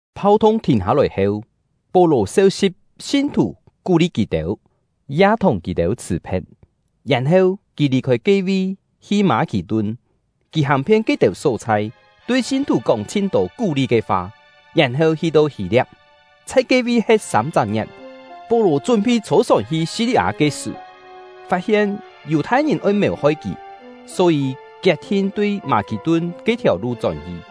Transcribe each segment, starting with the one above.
Phau-thung thìn hâ-lòi heu, Pó-lò seu-si̍p sin-thù, kú-li kì-têu, ya thùng kì-têu chhṳ̀-phe̍t. Yèn-heu, kì lì-khôi ke-vi, hi Mâ-khì-tun. Kì hàng-phien ke-têu só-chhai, tui sin-thù kóng chhin-tô kú-li ke fa, yèn-heu hi-to Hî-lia̍p, chhai ke-vi he̍t sâm-chak ngie̍t. Pó-lò chún-phi chhô-sòn hi Si-li-â ke sṳ̀, fat-hien Yù-thai-ngìn oi mèu-hoi kì, só-yî kiet-thin tui Mâ-khì-tun ke-thiàu lu chón-hi.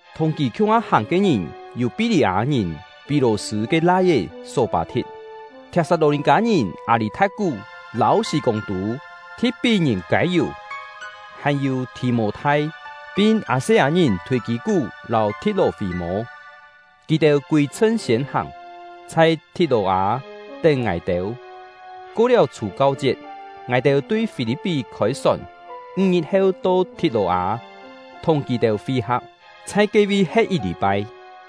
Thùng kì khiung-ha hàng ke ngìn yû Pí-lî-â-ngìn Pit-lò-sṳ̂ ke lai-é Só-pâ-thi̍t, Thiap-sat-lò-nì-kâ-ngìn Â-lî-tha̍t-kú lâu Sî-kûng-tû, Thi̍t-pí-ngìn Kâi-yù, hàn-yû Thì-mô-thai, pin Â-se-â-ngìn Thûi-kî-kú lâu Thi̍t-lò-fî-mô. Kì-têu kûi-chhṳn siên hàng, chhai Thi̍t-lò-â tén ngài-têu. Ko-liáu Chhù-kau-chiet, ngài-têu tui Fî-li̍p-pí khôi-sòn, ńg-ngit heu to Thi̍t-lò-â, thùng kì-têu fi-ha̍p, chhai ke-vi he̍t yit lî-pai.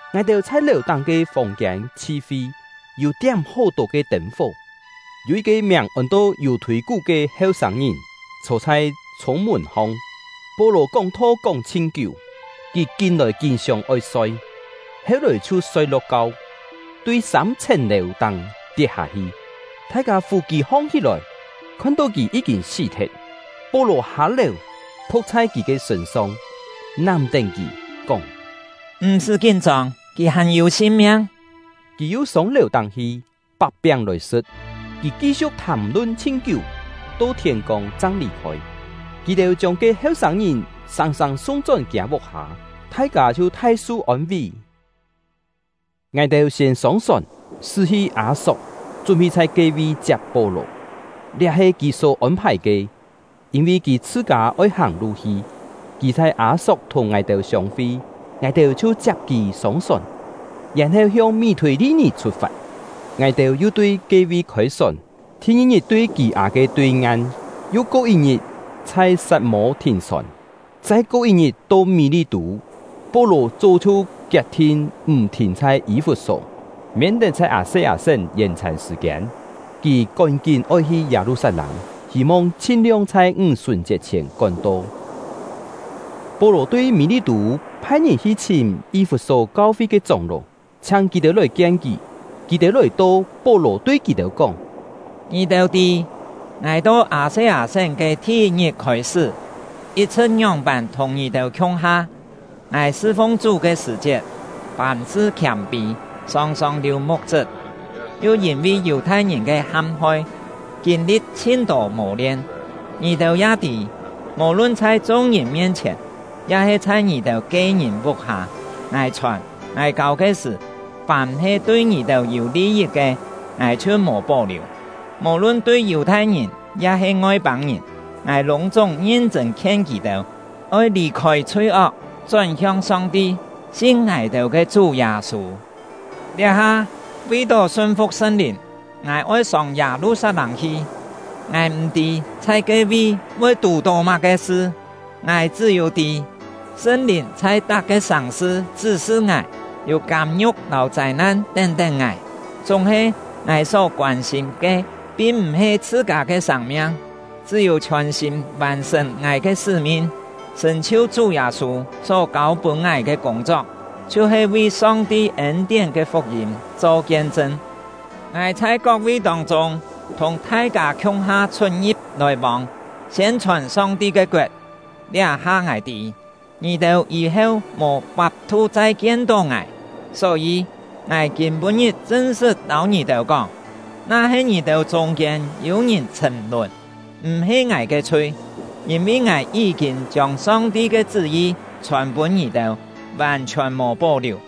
Ngài-têu chhai lèu-táng ke fòng-kiên chhi-fi, yû tiám hó-tô ke tên-fó. Yû yit-ke miàng ôn-to Yù-thûi-kú ke heu-sâng-ngìn chhô chhai chhûng-mùn-hong, Pó-lò kóng-tho kóng chhin kiú, kì kín-lòi kín sióng-oi soi, heu-lòi chhiu soi-lo̍k-kau, tui sâm-chhèn lèu-táng tiet-hâ-hi. Thai-kâ fù kì hong-hí-lòi, khon-tó kì yí-kîn sí-thet. Pó-lò hâ-lèu, phu̍k chhai kì ke sṳ̂n-song, nám-tén kì, kóng: “M̀-sṳ́ kín-chông, kì hàn-yû sin-miang!” Kì yu sông lèu-táng hi, pak-piáng lòi sṳ̍t. Kì ki-siu̍k thàm-lun chhin kiú, to thiên-kông chang lì-khôi. Kì-têu chiông ke heu-sâng-ngìn sâng-sâng sung-chón kiâ vuk-hâ, thai-kâ chhiu thai su ôn-ví. Ngài-têu siên sông-sòn, sṳ́-hi Â-sok, chún-phi chhai ke-vi chiap Pó-lò. Liá he kì só ôn-phài ke, yîn-vi kì chhṳ-kâ oi hàng-lu hi. Kì chhai Â-sok thùng ngài-têu siông-fi, ngài-têu chhiu chiap kì sông-sòn, yèn-heu hiong Mí-thûi-li-nì chhut-fat. Ngài-têu yu tui ke-vi khôi-sòn, thi-ngi-ngit to Kî-â ke tui-ngan; yu ko yit-ngit, chhai Sat-mô thìn-sòn, chai ko yit-ngit to Mí-li-tû. Pó-lò chó chhiu kiet-thin m̀ thìn chhai Yî-fut-só, miên-tet chhai Â-se-â-sén yèn-chhàn sṳ̀-kiên. Kì kón-kín oi hi Yâ-lu-sat-lâng, hî-mong chhin-liong chhai Ńg-sùn-chiet chhièn kón-to. Pó-lò tui Mí-li-tû phai-ngìn hi-chhìm Yî-fut-só kau-fi ke chóng-ló, chhiáng kì-têu lòi-kien kì. Kì-têu lòi-to, Pó-lò tui kì-têu kóng: “Ngì-têu tî, ngài to Â-se-â-sén ke thi-yit-ngit khôi-sṳ́, yit-chhṳ̍t ngióng-pân thùng ngì-têu khiung-ha, ngài sṳ-fung Chú ke sṳ̀-chiet, fàm-sṳ khiâm-pî, sòng-sòng liù muk-chṳp, yu yîn-vi Yù-thai-ngìn ke ham-hoi, kîn-li̍t chhin-tô mò-lien. Ngì-têu ya tî, mò-lun chhai chung-ngìn mien-chhièn, ya-he chhai ngì-têu ke-ngìn vuk-hâ, ngài chhòn, ngài kâu ke sṳ̀, fàm he tui ngì-têu yû li-yit ke, ngài chhiu mò pó-liù. Mò-lun tui Yù-thai-ngìn ya-he Ngoi-pâng-ngìn, ngài lûng-chúng ngin-chṳ̂n khien kì-têu, oi lì-khôi chhui-ok, chón-hiong Song-ti, sin ngài-têu ke Chú Yâ-sû. Liá-ha, vi-tó sun-fu̍k Sṳn-Lìn, ngài oi sông Yâ-lu-sat-lâng hi. Ngài m̀-tî chhai ke-vi voi tù-tó má-ke sṳ; ngài chṳ́-yû tî, Sṳn-Lìn chhai tak-ke sàng-sṳ chṳ́-sṳ ngài, yû kâm-ngiu̍k lâu châi-nan tén-tén ngài. Chúng-he, ngài só koân-sîm ke, pin m̀-he chhṳ-kâ ke sâng-miang, chṳ́-yû chhiòn-sîm vàn-sṳ̀n ngài ke sṳ́-min, sṳ̀n-chhiu Chú Yâ-sû só kâu-pûn ngài ke kûng-chok, chhiu-he vi Song-ti ên-tién ke fuk-yîm cho kien-chṳn. “Ngài chhai kok-vi tông-chûng thùng thai-kâ khiung-ha chhut-ngi̍p lòi-vông, siên-chhòn Song-ti ke koet. Liá-ha ngài tî, ngì-têu yî-heu mò fap-thu chai kien-tó ngài. Só-yî, ngài kîm-pû-ngit chṳn-sṳt lâu ngì-têu kóng, na-he ngì-têu chûng-kiên yû ngìn chhṳ̀m-lùn, m̀-he ngài ke chhui; yîn-vi ngài yí-kîn chiông Song-ti ke chṳ́-yi chhòn-pûn ngì-têu, vàn-chhiòn mò pó-liù.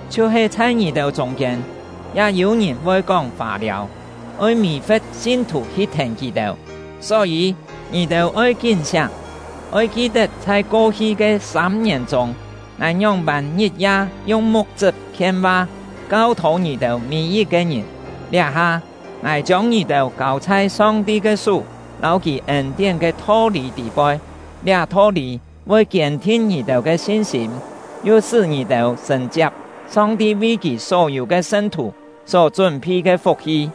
Chhiu-he chhai ngì-têu chûng-kiên, ya yû ngìn voi kóng fâ-liâu, oi mì-fe̍t sin-thù hi thèn kì-têu. Só-yî, ngì-têu oi kín-siáng! Oi ki-tet chhai ko-hi ke sâm-ngièn chûng, ngài ngióng-pân ngit-ya yung muk-chṳp khien-va, kau-thô ngì-têu mî-yit-ke ngìn. “Liá-ha, ngài chiông ngì-têu kâu chhai Song-ti ke sú lâu Kì ên-tién ke tho-lî tî-poi. Liá tho-lî voi kiên-thin ngì-têu ke sin-sîm, yu sṳ́ ngì-têu sṳ̀n-chiap Song-ti vi Kì só-yû ke sṳn-thù só chún-phi ke fuk-hi.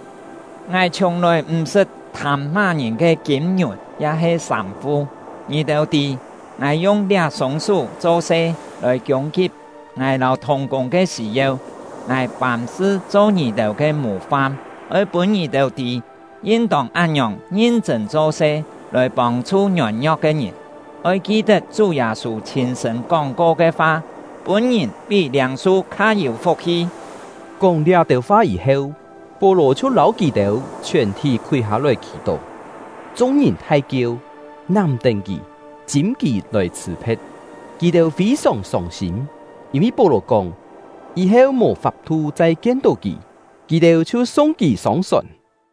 Ngài chhiùng-lòi m̀ sṳt thâm má-ngìn ke kîm-ngiùn ya-he sâm-fu. Ngì-têu tî, ngài yung liá-sûng sú cho-se lòi kiûng-kip ngài lâu thùng-kûng ke sî-yeu. Ngài fàm-sṳ cho ngì-têu ke mù-fam, oi pûn ngì-têu tî, yin-tông án-ngiòng ngin-chṳ̂n cho-se lòi pông-chhu ngiôn-ngio̍k ke ngìn. Oi ki-tet Chú Yâ-sû chhîn-sṳ̂n kóng-ko ke fa: ‘Pûn-ngìn pí liâng-su kha yû fuk-hi.’” Kóng liá-têu fa yî-heu, Pó-lò chhiu lâu kì-têu chhiòn-thí khúi hâ-lòi khì-tó. Chung-ngìn thai-kieu, nám-tén kì, chîm kì lòi chhṳ̀-phe̍t. Kì-têu fî-sòng sông-sîm, yîn-vi Pó-lò kóng, yî-heu mò fap-thu chai kien-tó kì. Kì-têu chhiu sung kì sông-sòn.